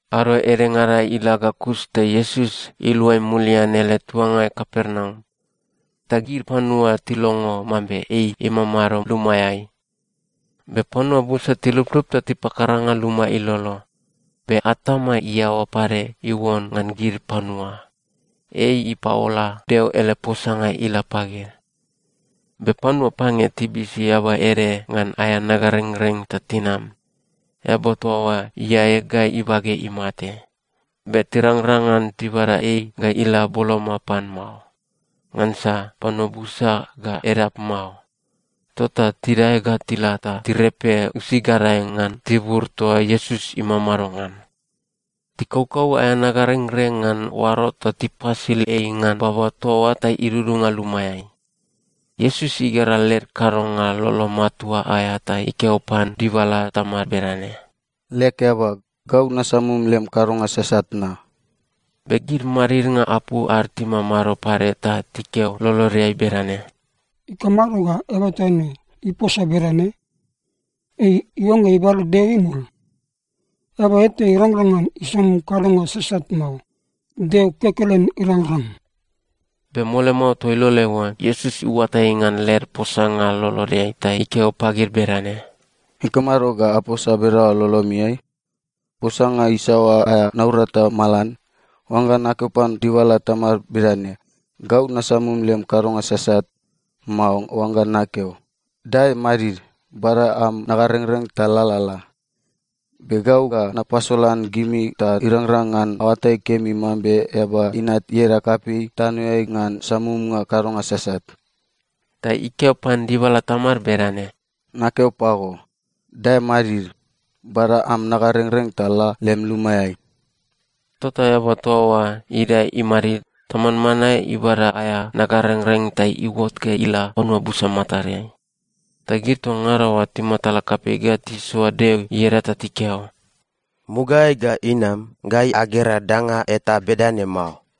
Ado edengada ila ga kus ta Iesus iluai mulian ele tuangai Kapernaum. Ta gid panua tilongo mambe ei imamado lumaeai. Be panua busa tiluplup ta tipakaranga luma ilolo, be atama iaoa pade iuon ngan gid panua. Ei ipaola Deo ele posanga ila pagid. Be panua pange tibisi eaba ede ngan aea nagarengreng ta tinam. Eaba toa oa iae ga ibage imate. Be tirangrang ngan tibada ei ga ila boloma pan mao, ngansa panua busa ga edap mao. Tota tidae ga tila ta tirepe usi gadae ngan tibur toa Iesus imamado ngan. Tikaukau aea nagarengreng ngan oaro ta tipasil ei ngan baba toa oa ta idudunga lumaeai. Iesus igera led kadonga lolo matua aea ta ikeo pan dibala tamad bedane, “Leg eaba, gau nasamum lem kadonga sasat na.” Be gid madidnga apu ad timamado pade ta tikeo lolodeai bedane, “Ikamado ga eaba toa ne iposa bedane? Ei iuangga ibada Deo imul! Eaba eta irangrang ngan isamum kadonga sasat mao. Deo kekelen irangrang.” Be mole mao toa iloleai oa, Iesus iuatai ngan led posanga lolodeai ta ikeo pagid bedane, “Ikamado ga aposa bedaoa lolomiai? Posanga isaoa aea naurata malan: oangga nakeo pan dibala tamad bedane, ‘Gau nasamum lem kadonga sasat,’ mao oangga nakeo, ‘Dae madid, bada am nagarengreng ta lalala’? Be gau ga napasolan gimi ta irangrang ngan aoatai kemi mambe Eaba Inat ieda kapei tanoeai ngan samumnga kadonga sasat.” Ta ikeo pan dibala tamad bedane, “Nakeo pago, dae madid, bada am nagarengreng ta la lem lumaeai.” Tota eaba toa oa idae imadid ta manmanae ibada aea nagarengreng ta iuot ga ila panua busa matadeai. Ta gid toa ngada oa timatala kapei ga tisoa Deo ieda ta tikeo, “Mugaeai ga inam, gai agera danga eta bedane mao!”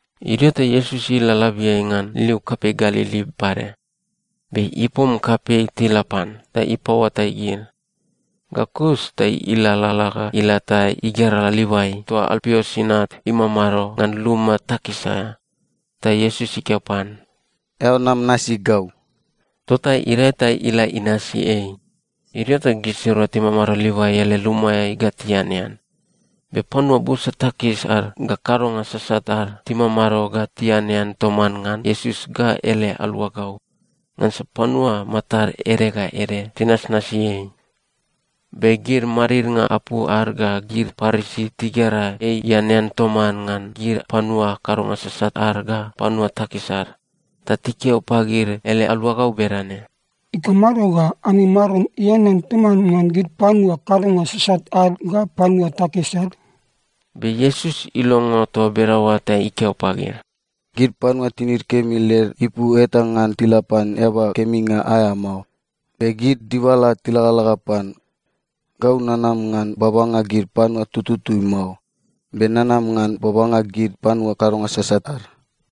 Idio ta Iesus ila labiai ngan liu kapei Galili pade. Be ipom kapei tila pan, ta ipaoatai gid. Ga kus ta ilalala ga ila ta igera Livai toa Alpius inat imamado ngan luma takis aea. Ta Iesus ikeo pan, “Eao nam nasi gau.” Tota idae ta ila inasi ei. Idio ta gisirua timamado Livai ele lumaeai ga tianean. Be panua busa takis ad ga kadonga sasat ad timamado ga tianean toman ngan Iesus ga ele aluagau. Ngansa panua matad ede ga ede tinasnasi ei. Be gid madidnga apu ad ga gid Parisi tigera ei ianean toman ngan gid panua kadonga sasat ad ga panua takis ad, ta tikeo pagid ele aluagau bedane, “Ikamado ga ami Maron ianean toman ngan gid panua kadonga sasat ad ga panua takis ad?” Be Iesus ilongo toa bedaoa ta ikeo pagid, “Gid panua tinid kemi led ipu eta ngan tila pan eaba keminga aea mao, be gid dibala tilagalaga pan. Gau nanam ngan babanga gid panua tututui mao, be nanam ngan babanga gid panua kadonga sasat ad.”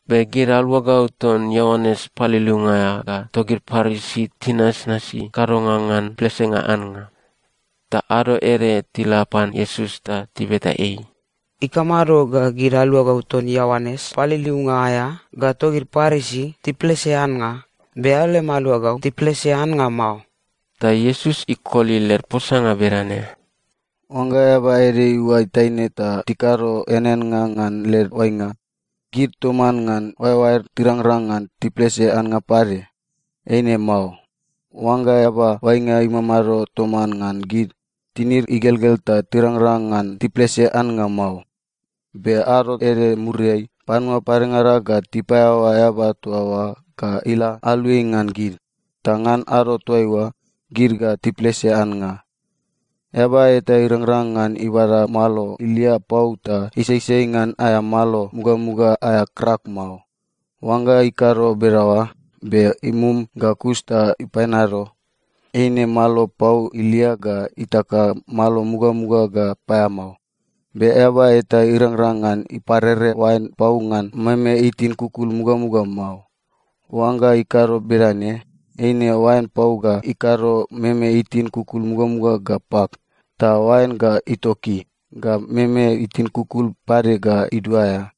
Be gid aluagau ton Ioanes Paliliunga aea ga togid Parisi tinasnasi kadonga ngan plesenga annga. Ta ado ede tila pan Iesus ta tibeta ei, “Ikamado ga gid aluagau ton Ioanes Paliliunga aea ga togid Parisi tiplese annga, be eao lem aluagau tiplese annga mao?” Ta Iesus ikoli led posanga bedane, “Oangga eaba ede iuai taine ta tikado eaneannga ngan led oainga, gid toman ngan oaeoaed tirangrang ngan tiplese annga pade? Eine mao. Oangga eaba oainga imamado toman ngan gid, tinid igelgel ta tirangrang ngan tiplese annga mao. Be ado ede muriai, panua padengada ga tipaeaoa eaba toa oa ga ila aluai ngan gid. Ta ngan ado toaiua, gid ga tiplese annga. “Eaba eta irangrang ngan ibada malo ilia pau ta isaisai ngan aea malo mugamuga aea krak mao. Oangga ikado bedaoa, be imum ga kus ta ipaeanado, eine malo pau ilia ga itaka malo mugamuga ga paeamao. Be eaba eta irangrang ngan iparere oain pau ngan meme itin kukul mugamuga mao. Oangga ikado bedane, eine oain pau ga ikado meme itin kukul mugamuga ga pak. Ta oain ga itoki, ga meme itin kukul pade ga iduaea.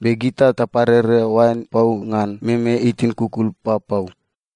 Be gita taparere oain pau ngan meme itin kukul papau.”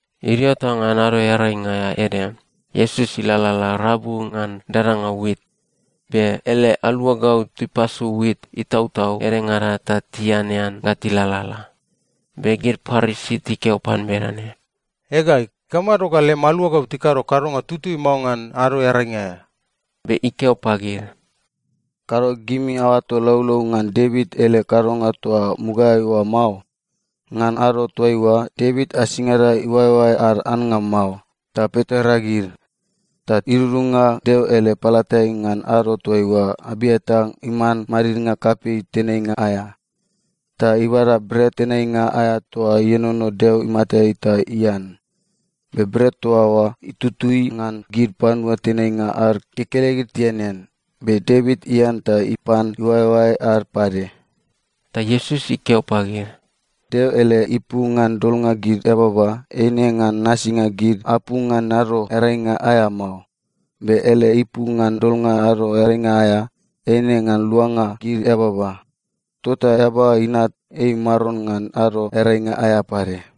Idio ta ngan Ado Earainga aea ede, Iesus ilalala rabu ngan dadanga wit, be ele aluagau tipasu wit itautau edengada ta tianean ga tilalala. Be gid Parisi tikeo pan bedane, “Ega, ikamado ga lem aluagau tikado kadonga itutui mao ngan Ado Earainga aea?” Be ikeo pagid, “Kado gimi aoato laulau ngan Devit ele kadonga toa mugaeai oa mao? Ngan ado toaiua, Devit asingada iuaeoae ad annga mao, ta pitoreagid. Ta idudunga Deo ele palatai ngan ado toaiua Abiatar iman madidnga kapei tenainga aea, ta ibada bret tenainga aea toa ienono Deo imatai ta ian. Be bret toa oa, itutui ngan gid panua tenainga ad kekelegid tianean. Be Devit ian ta ipan iuaeuae ad pade.” Ta Iesus ikeo pagid, “Deo ele ipu ngan dolnga gid eababa, eine ngan nasinga gid apu ngan Ado Earainga aea mao. Be ele ipu ngan dolnga Ado Earainga aea, eine ngan luanga gid eababa. Tota Eaba Inat, ei Maron ngan Ado Earainga aea pade.”